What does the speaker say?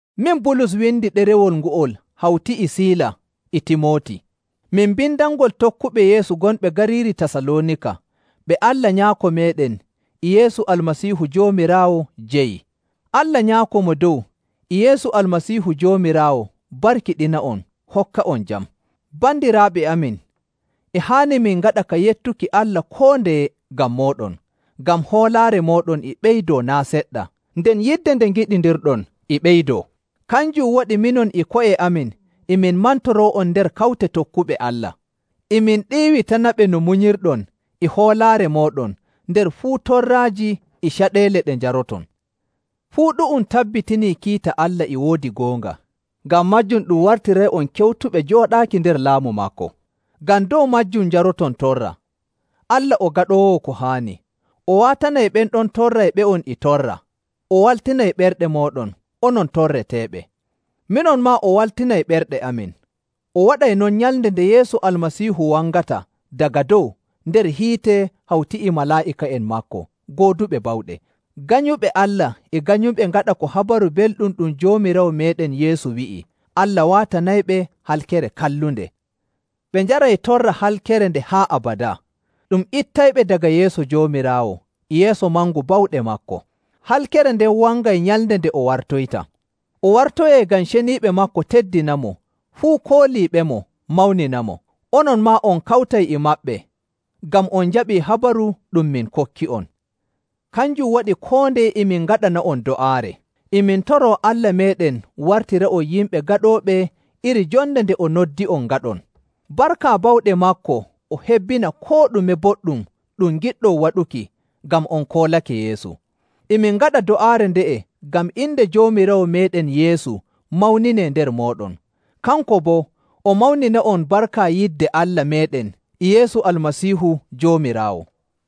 Min Bulus windi ɗerewol ngo'ol hawti e Siila e Timooti. Min mbindanngol tokkuɓe Yeesu gonɓe gariiri Tasaloonika, ɓe Allah Nyaako meeɗen e Yeesu Almasiihu Joomiraawo jeyi. Allah Nyaako Mo Dow e Yeesu Almasiihu Joomiraawo barkiɗina'on hokka'on jam. Bandiraaɓe amin, e haani min ngaɗa ka yettuki Allah koo ndeye ngam mooɗon, ngam hoolaare mooɗon e ɓeydoo naa' seɗɗa, nden yidde nde ngiɗindiron e ɓeydoo. Kanjum waɗi minon e ko'e amin e min mantoroo'on nder kawte tokkuɓe Allah. E min ɗiiwitanaɓe no munyirɗon e hoolaare mooɗon nder fuu torraaji e caɗeele ɗe njaroton. Fuu ɗu'um tabbitinii kiita Allah e woodi goonga, ngam maajum ɗum wartiray'on kewtuɓe jooɗaaki nder laamu maako, ngam dow maajum njaroton torra. Allah o gaɗoowo ko haani. O waatanay ɓen ɗon torrayɓe'on e torra, o waltinay ɓerɗe mooɗon onon torreteeɓe. Minon maa o waltinay ɓerɗe amin. O waɗay non nyalnde nde Yeesu Almasiihu wangata daga dow nder hiite hawti e malaa'ika'en maako gooduɓe bawɗe. Ganyuɓe Allah e ganyuɓe ngaɗa ko Habaru Belɗum ɗum Joomiraawo meeɗen Yeesu wi'i, Allah waatanayɓe halkere kallunde. Ɓe njaray torra halkere nde haa abadaa, ɗum ittayɓe daga yeeso Joomiraawo e yeeso mangu bawɗe maako. Halkere nden wangay nyalnde nde o wartoyta. O wartoyay ngam ceniiɓe maako teddinamo fuu kooliiɓemo mawninamo. Onon maa on kawtay e maɓɓe, ngam on njaɓii habaru ɗum min kokki'on. Kanjum waɗi koo ndeye e min ngaɗana'on do'aare. E min toroo Allah meeɗen wartira'on yimɓe gaɗooɓe iri jonde nde o noddi'on ngaɗon. Barka bawɗe maako o hebbina koo ɗume boɗɗum ɗum ngiɗɗon waɗuki ngam on koolake Yeesu. E min ngaɗa do'aare nde'e ngam inde Joomiraawo meeɗen Yeesu mawninee nder mooɗon, kanko boo o mawnina'on barka yidde Allah meeɗen e Yeesu Almasiihu Joomiraawo.